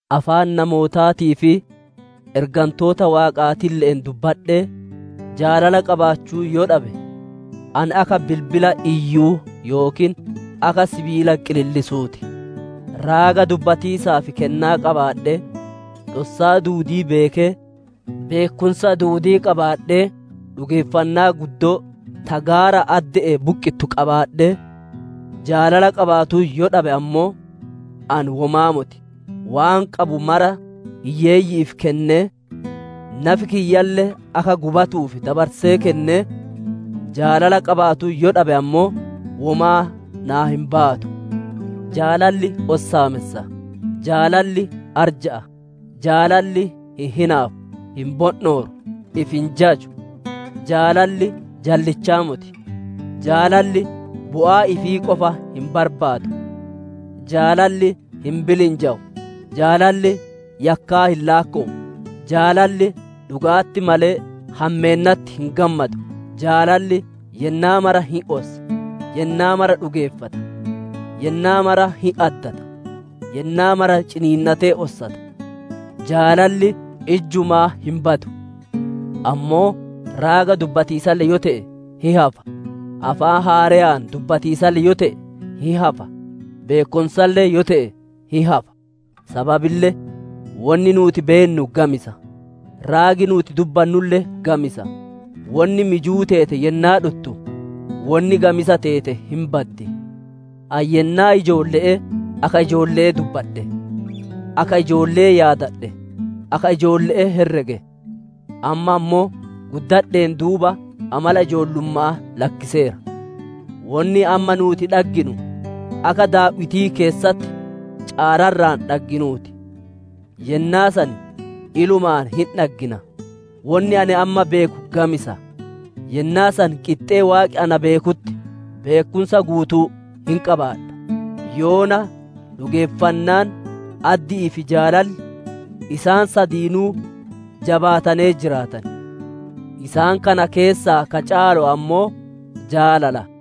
Afaan namootaatii fi ergantoota Waaqaatille'een dubbadhee, jaalala qabaachuu yoo dhabe, ani akka bilbila iyyuu yookiin akka sibiila qilillisuu ti. Raaga dubbatiisaaf kennaa qabaadhee, dhossaa duudii beekee, beekkumsa duudii qabaadhee, dhugeeffannaa guddoo ta gaara adde'ee buqqittu qabaadhee, jaalala qabaatuu yoo dhabe ammoo, ani womaa moti. Waan qabu mara hiyyeeyyi'iif kennee, nafi kiyyalle akka gubatuuf dabarsee kennee, jaalala qabaatuu yoo dhabe ammoo, womaa naa hin baatu. Jaalalli ossaamessa; jaalalli arja'a; jaalalli hin hinaafu; hin bondhooru; ifi hin jaju. Jaalalli jallichaa moti; jaalalli bu'aa ifii qofa hin barbaadu; jaalalli hin bilinjawu; jaalalli yakkaa hin laakkowu. Jaalalli dhuga'atti malee, hammeennatti hin gammadu. Jaalalli yennaa mara hin ossa; yennaa mara dhugeeffata; yennaa mara hin addata; yennaa mara ciniinnatee ossata. Jaalalli ijjumaa hin badu; ammoo raaga dubbatiisalle yoo te'e, hin hafa; afaan haareyaan dubbatiisalle yoo te'e, hin hafa; beekkumsalle yoo te'e, hin hafa. Sababille wonni nuuti beennu gamisa; raagi nuuti dubbannulle gamisa. Wonni mijuu teete yennaa dhuttu, wonni gamisa teete hin baddi. Ani yennaa ijoolle'ee akka ijoolle'ee dubbadhe; akka ijoolle'ee yaadadhe; akka ijoolle'ee herrege; amma ammoo, guddadheen duuba amala ijoollumma'aa lakkiseera. Wonni amma nuuti dhagginu akka daaw'itii keessatti caararra'aan dhagginuu ti; yennaa san ilumaan hin dhaggina. Wonni ani amma beeku gamisa; yennaa san qixxee Waaqi na beekutti, beekkumsa guutuu hin qabaadha. Yoona dhugeeffannaan, addi'ii fi jaalalli, isaan sadiinuu jabaatanee jiraatan; isaan kana keessaa ka caalu ammoo jaalala.